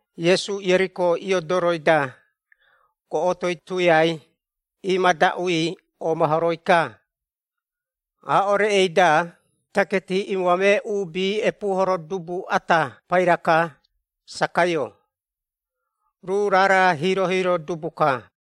Iesu Ieriko iodoroi-da, goꞌotoi tuiai imadaꞌui omahoroi-ka. Aaꞌo reꞌei-da taketi iimoamee uubi epuuhoro dubu ata pairai-ka, Sakaio, ruu raara hiiro-hiiro dubu-ka.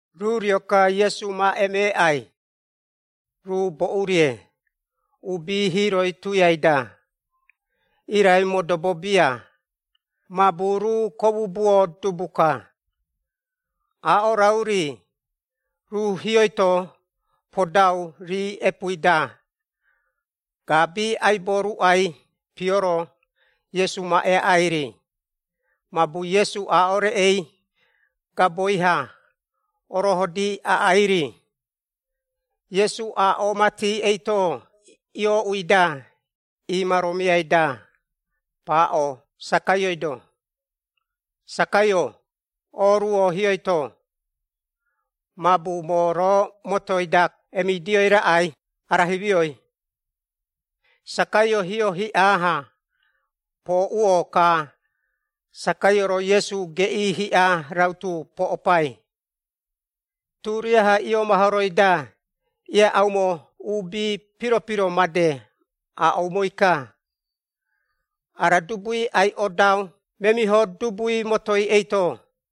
Ruu rio-ka Iesu ma emeeꞌai, ruu boꞌu-rie, uubi hiiroi tuiai-da, irai modobo bia mabu ruu komubuo dubu-ka Aaꞌo raꞌu-ri, ruu hioi-to podau rii epuui-da gaabi aibo ruꞌai pioro Iesu ma eaꞌai-ri, mabu Iesu aaꞌo reꞌei gaboi-ha orohodi aꞌai-ri. Iesu aaꞌo mati eito iooꞌui-da, imaromiai-da paaꞌo Sakaioi-do, “Sakaio, oruo hioi-to, mabu moo roo motoi-da emidioi raꞌai ara himioi.” Sakaio hio hiꞌa-ha pooꞌuo, ka Sakaio-ro Iesu geꞌii hiꞌa rautu poꞌopai. Turiaha iomahoroi-da, ieaꞌaumo uubi piro-piro made aaꞌoumoi-ka, “Ara dubui ai-odau memiho dubui motoi eito.”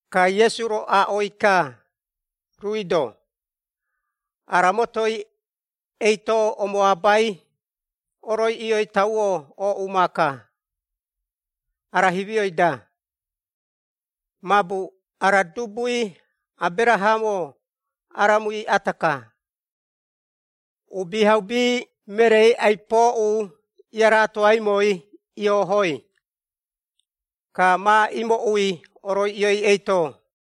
Ka Iesu-ro aaꞌoi-ka, ruui-do, “Ara motoi eito omoaabai, oroiꞌioi tauo ooꞌu maaka, ara himioi-da. Mabu ara dubui Aberahamo aramui ata-ka. Uubihaubi mereei ai-pooꞌu iaratoaimoi iohoi, ka ma imooꞌui oroiꞌioi eito.”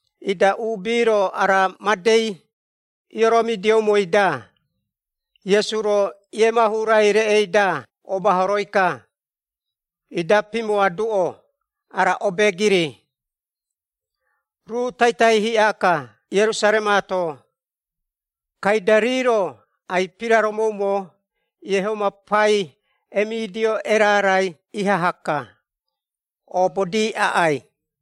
Ida uubi-ro ara madei ioromidioumoi-da, Iesu-ro iemahurai reꞌei-da omahoroi-ka, ida pimoaduꞌo ara obeegiri. Ruu taitai hiꞌa-ka Ierusaremaato, kaida rii-ro ai-piraromoumo Iehoma pai emidio erarai ihaha-ka, oobodi aꞌai.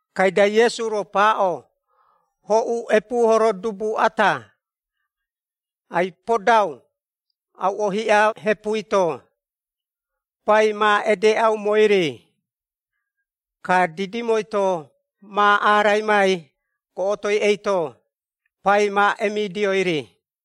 Kaida Iesu-ro paaꞌo, “Hoꞌu epuuhoro dubu ata, ai-podau auꞌo hiꞌa hepui-to, Pai ma edeeꞌaumoi-ri, ka didimoi-to ma araimai goꞌotoi eito, pai ma emidioi-ri.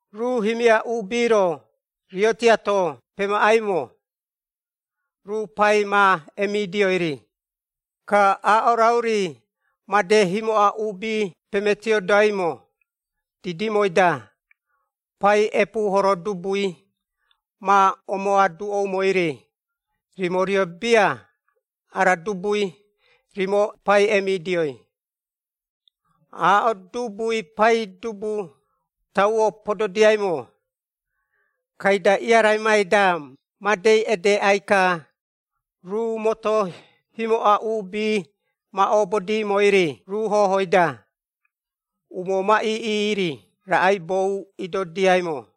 Ruu himia uubi-ro, rio tiato pemaꞌaimo, ruu pai ma emidioi-ri, ka aaꞌo raꞌu-ri, made himoꞌa uubi pemetiodoaimo, didimoi-da, pai epuuhoro dubui, ma omoaduꞌoumoi-ri, ‘Rimo rio bia ara dubui, rimo pai emidioi.’ “Aaꞌo dubui paidubu tauo pododiaimo, kaida iaraimai-da, made edeꞌai-ka, ruu moto himoꞌa uubi ma oobodimoi-ri ruu hohoi-da, umoo ma iiꞌi-ri raꞌaibou idodiaimo.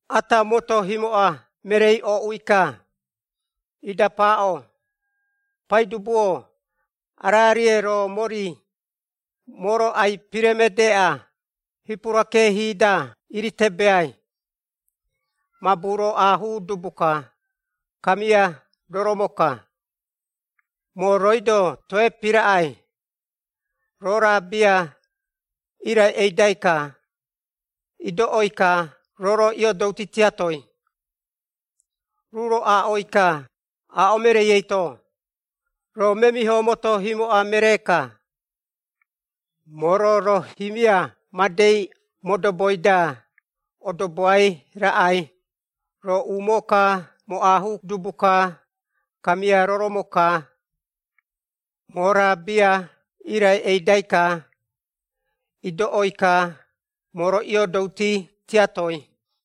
“Ata moto himoꞌa mereei ooꞌui-ka, ida paaꞌo, ‘Paidubu-o, ara-rie roo mori, moo-ro ai-piremedeeꞌa, hipura keehi-da iretebeai. Mabu roo aahuu dubu-ka, kamia roromo-ka, moo rooi-do toe piraꞌai, roo raa bia, irai eidai-ka, idoꞌoi-ka roo-ro iodouti tiatoi.’ Ruu-ro aaꞌoi-ka aaꞌo mereei eito, ‘Roo memiho moto himoꞌa meree-ka! Moo-ro roo himia madei modoboi-da odoboai raꞌai! Roo umoo-ka moo aahuu dubu-ka, kamia roromo-ka, moo raa bia irai eidai-ka, idoꞌoi-ka moo-ro iiodouti tiatoi.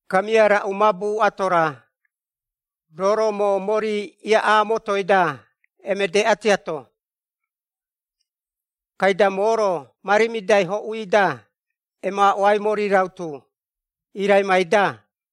Kamia raꞌu mabu ato-ra, roo-ro moo mori iiꞌa motoi-da emedeꞌa tiato? Kaida moo-ro ma rimidai hoꞌui-da emaꞌoai mori rautu, iiraimai-da.’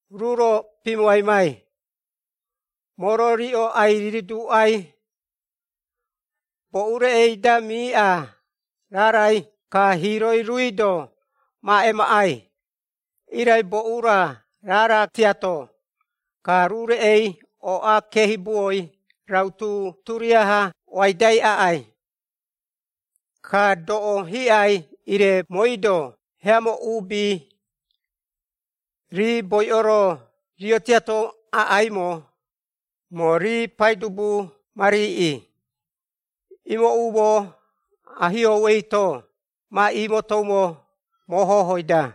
Ruu-ro pimoaimai, ‘Moo-ro riꞌo ai-riduuꞌai, boꞌou reꞌei-da miiꞌa raarai, ka hiiroi ruui-do ma emaꞌai. Irai boꞌu-ra raara tiatoi, ka ruu reꞌei ooꞌa keehibuo rautu, turiaha ooaidai aꞌai. Ka, doꞌo hiꞌai, ire mooi-do heamo uubi, rii boiꞌo-ro rio tiato aꞌaimo, moo rii Paidubu ma riiꞌi, imooꞌumo, ahiou eito ma imotoumo moo hohoi-da.’”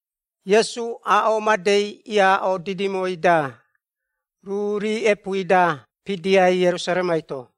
Iesu aaꞌo madei iaaꞌo didimoi-da, ruu rii epuui-da pidiai Ierusaremai-to.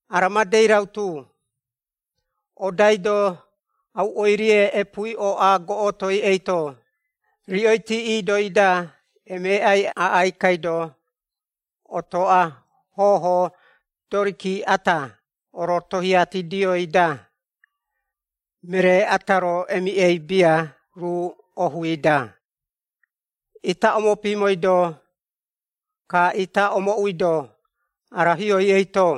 ara madei rautu, “Odaido auoirie epuui ooꞌa goꞌotoi eito, riꞌoiti iidoi-da emeeꞌai aꞌai kaido otoꞌa hoho doriki ata orotohiatidioi-da, meree ata-ro emiꞌei bia ruu ohui-da. Ita omopimoido, ka ita omooꞌuido ara hiou eito.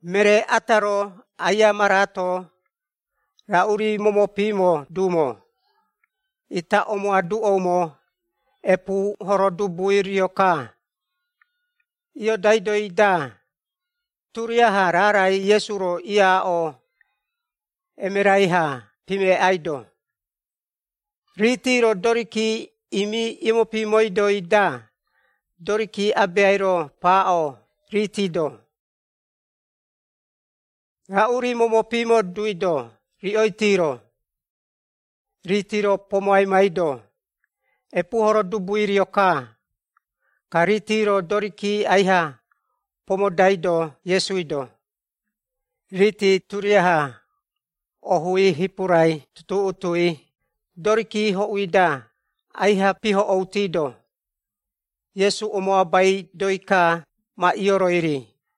Meree ata-ro aia maraato, raꞌu-ri momopimo duumo, ita omoaduꞌoumo, ‘Epuuhoro dubui rio-ka.’” Iodaidoi-da, turiaha raarai Iesu-ro iaaꞌo emerai-ha pimeꞌaido. Riiti-ro doriki imi iomopimoidoi-da, doriki abeai-ro paaꞌo, riiti-do, “Raꞌu-ri momopimo duido riꞌoiti-ro?” Riiti-ro pomoaimaido, “Epuuhoro dubui rio-ka.” Ka riiti-ro doriki aiha pomodaido Iesui-do, riiti turiaha ohui hipura tutuꞌutui, doriki hoꞌui-da aiha pihoꞌoutido, Iesu omoabaidoi-ka, ma ioroi-ri.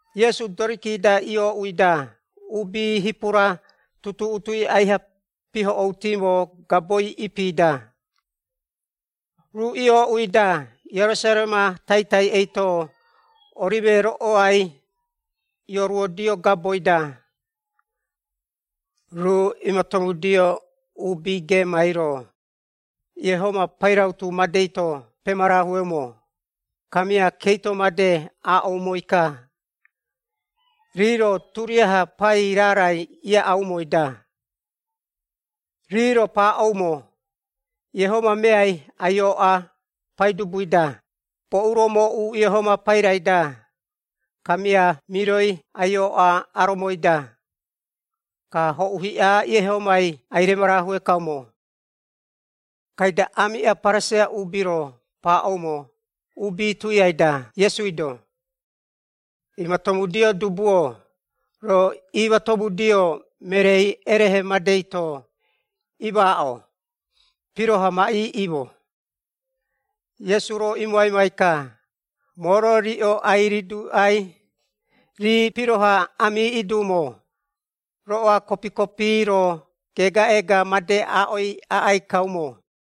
Iesu doriki-da iooꞌui-da, uubi hipura tutuꞌutui aiha pihoꞌoutimo gaboi ipi-da. Ruu iooꞌui-da Ierusarema taitai eito, Orime roꞌoai ioruodio gaboi-da, ruu iimatomudio uubi geemai-ro, Iehoma pairautu madei-to pemarahueumo, kamia keito made aaꞌoumoi-ka, rii-ro turiaha pai raarai iaꞌaumoi-da. Rii-ro paaꞌoumo, “Iehoma meai ai-ooꞌa, Paidubui-da, boꞌu-ro mooꞌu Iehoma pairai-da, kamia miroi ai-ooꞌa aromoi-da, ka hoꞌu hiꞌai Iehomai, ai-remarahue kaumo!” Kaida aamiꞌa Pariseia uubi-ro paaꞌoumo uubi tuiai-da Iesui-do, “Imatomudio dubu-o, roo iimatomudio mereei erehe madei-to imaaꞌo piroha ma iiꞌimo!” Iesu-ro imoaimai-ka, “Moo-ro riꞌo ai-riduuꞌai, rii piroha amiiꞌi duumo, roꞌoa kopi-kopi-ro geegaꞌeega made aaꞌoi aꞌai kaumo.”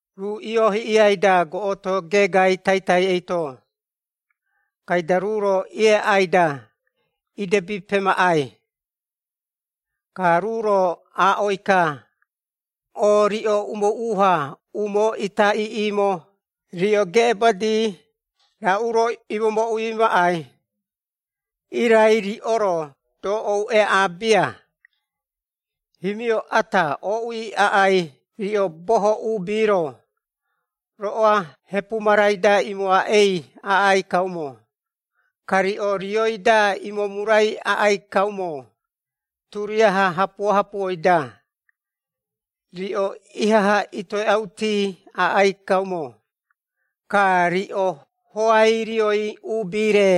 Ruu iohiꞌiai-da goꞌoto geegai taitai eito, kaida ruu-ro ieaꞌai-da, idebi pemaꞌai. Ka ruu-ro aaꞌoi-ka, “O, riꞌo umoꞌu-ha umoo ita iiꞌimo, riꞌo geꞌebadi raꞌu-ro imomooꞌui maꞌai! Irai riꞌo-ro doꞌou eaꞌaa bia! Himio ata ooꞌui aꞌai, riꞌo boho uubi-ro, roꞌoa hepu marai-da iimoaaꞌei aꞌai kaumo, ka riꞌo rioi-da imomurai aꞌai kaumo, turiaha hapuo-hapuoi-da. Riꞌo ihaha itoeꞌauti aꞌai kaumo, ka riꞌo hoai rioi uubi-re,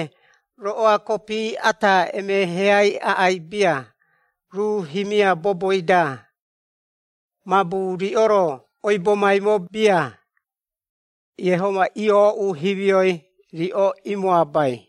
roꞌoa kopi ata emeheai aꞌai bia, ruu himia boboi-da. Mabu riꞌo-ro oibomaimo bia, Iehoma iooꞌu himioi, riꞌo imoabai.”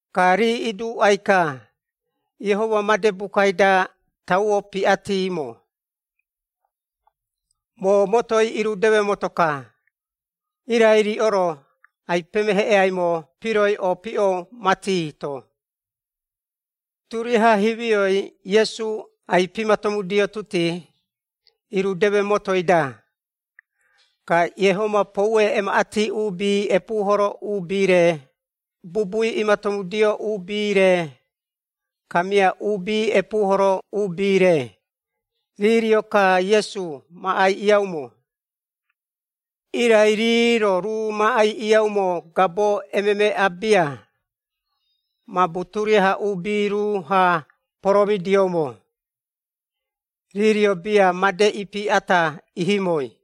Ka rii iduuꞌai-ka, “Iehoma made bukai-da tauo piꞌatimo, ‘Moo motoi irudeme moto-ka,’ irai riꞌo-ro ai-pemeheꞌeaimo piroi opiꞌo mati-to!” Turiaha himioi Iesu ai-pimatomudiotuti, irudeme motoi-da. Ka Iehoma poue emaꞌati uubi epuuhoro uubi-re, bubui imatomudio uubi-re, kamia uubi epuuhoro uubi-re, rii rio-ka Iesu ma aiꞌiaumo. Irai rii-ro ruu ma aiꞌiaumo gabo emeemeꞌa bia, mabu turiaha uubi ruu-ha poromidioumo. Rii rio bia made ipi ata ihimoi.